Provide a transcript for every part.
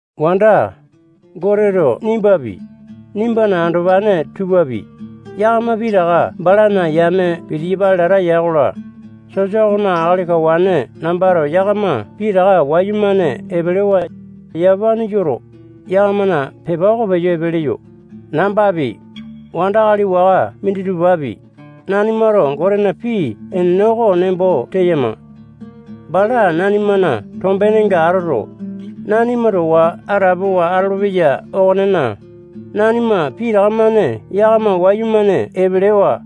Wanda, Goteto nimbapi, nimbana andopane tupapi, yakama pitaka balana yame pitiyapale lata ya-kola, sosa okona akali kawane nambato yakama pitaka wayumane epelewa, yamapane yoto, yakamana pepa oko peyo epe leyo. Nambapi, wandakali waka minditupapi, nanimato Gotena pii enene oko nembo teyama. Bala nanimana tombenenga atoto, nanima towa atapowa atolopeya okonena, nanima pitaka-mane yakama wayumane epelewa,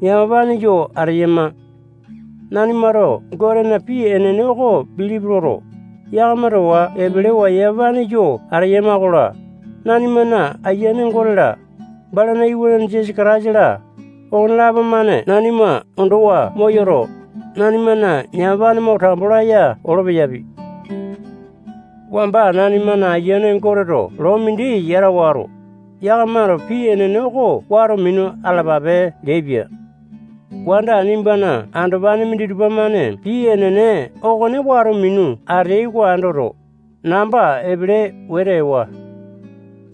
yamapane yo ateyama. Nanimato Gotena pii enene oko bilipi loto, yakama towa epelewa yamapane yo ateyama-kola, nanimana Ayiane Gote-la, balana Iwanane Jisasa Kataisa-la, okonelapo-mane nanima ondowa moyoto, nanimana yamapane mo tambo laya olo-peyapi. Wamba nanimana Ayiane Goteto loo mindi yata wato, yakamato pii enene oko wato minu atalapape leaipia. Wanda nimbana andopane minditupa-mane pii enene okone wato minu ateai oko andoto, namba epele wete ewa.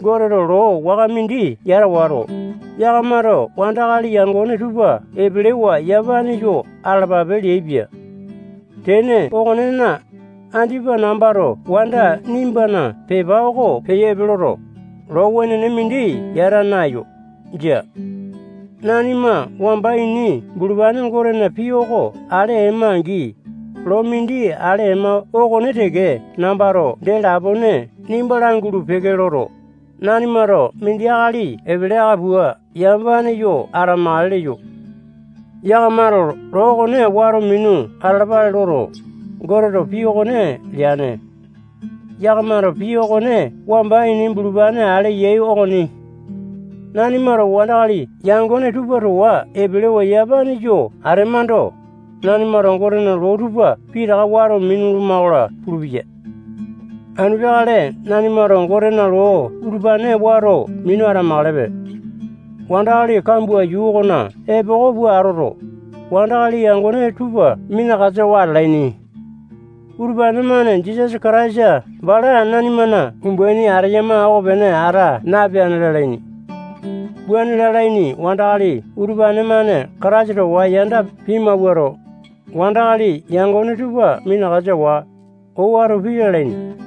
Goteto loo waka mindi yata wato, yakamato wandakali yangone tupa epelewa yamapane yo atalapape leaipia. Tene okonena, andipa nambato wanda nimbana pepa oko peyo epe loto, loo wenene mindi yata naeyo. Jia. Nanima wamba ini bulupane Gotena pii oko ale ema-angi, loo mindi ale ema okone teke nambato dee lapone nimba langulu-peke loto, nanimato mindi akali epele aka pua yamapane yo atamakale leyo. Yakamato loo okone wato minu atalapale loto, Goteto pii okone leane. Yakamato pii okone wamba ini bulupane ale yai okoni. Nanimato wandakali yangone tupa towa epelewa yamapane yo atemando, nanimato Gotena loo tupa pitaka wato minuluma-kola pulupeya. Anu peakale nanimato Gotena loo utupane wato minu atamakalepe. Wandakali kambua yuu okona epoko pua atoto, wandakali yangone tupa minakasawa atalaini. Utupane-mane Jisasa Kataisa bala nanimana umbaini ateyama okopene ata napeane lalaini. Wuane lalaini wandakali utupane-mane Kataisa towa yanda pimawuato, wandakali yangone tupa minakasawa, owato pii lalaini.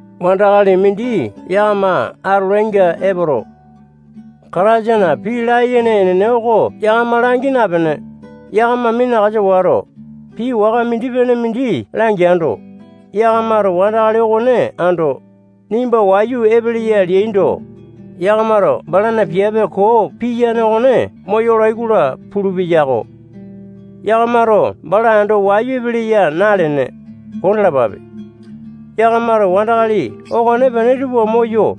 Wandakali mindi yakama atolainga epoto, Kataisana pii layene enene oko yakama langi napene, yakama minakasa wato, pii waka mindi-pene mindi langeando, yakamato wandakali okone ando, nimba wayu epeleya leaindo, yakamato balana piape koo piyane okone moyolai-kola pulu-peyako. Yakamato bala ando wayu epeleya nalene, kondalapape. Yakamato wandakali okonepene tupa moyo,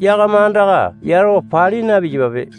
yakama andaka yatawa pali na-piyapape.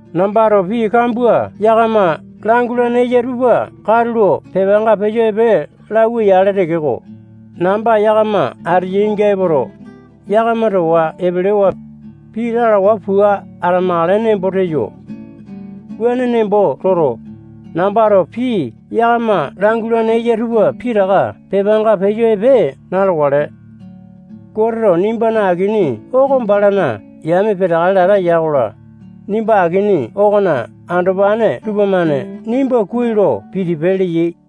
Nambato pii kambua yakama langulane eya tupa katulo pepanga peyo epe lauwa-yale tekeko, namba yakama ateyainga epoto, yakama towa epelewa, pii lalawa pua atamakale nembo teyo. Wuane nembo toto, nambato pii yakama langulane eya tupa pitaka pepanga peyo epe na-lokale. Goteto nimbana akini oko balana yame peteakale lata ya-kola, nimba akini okona andopane tupamane nimba kuai lo pitipe leyai.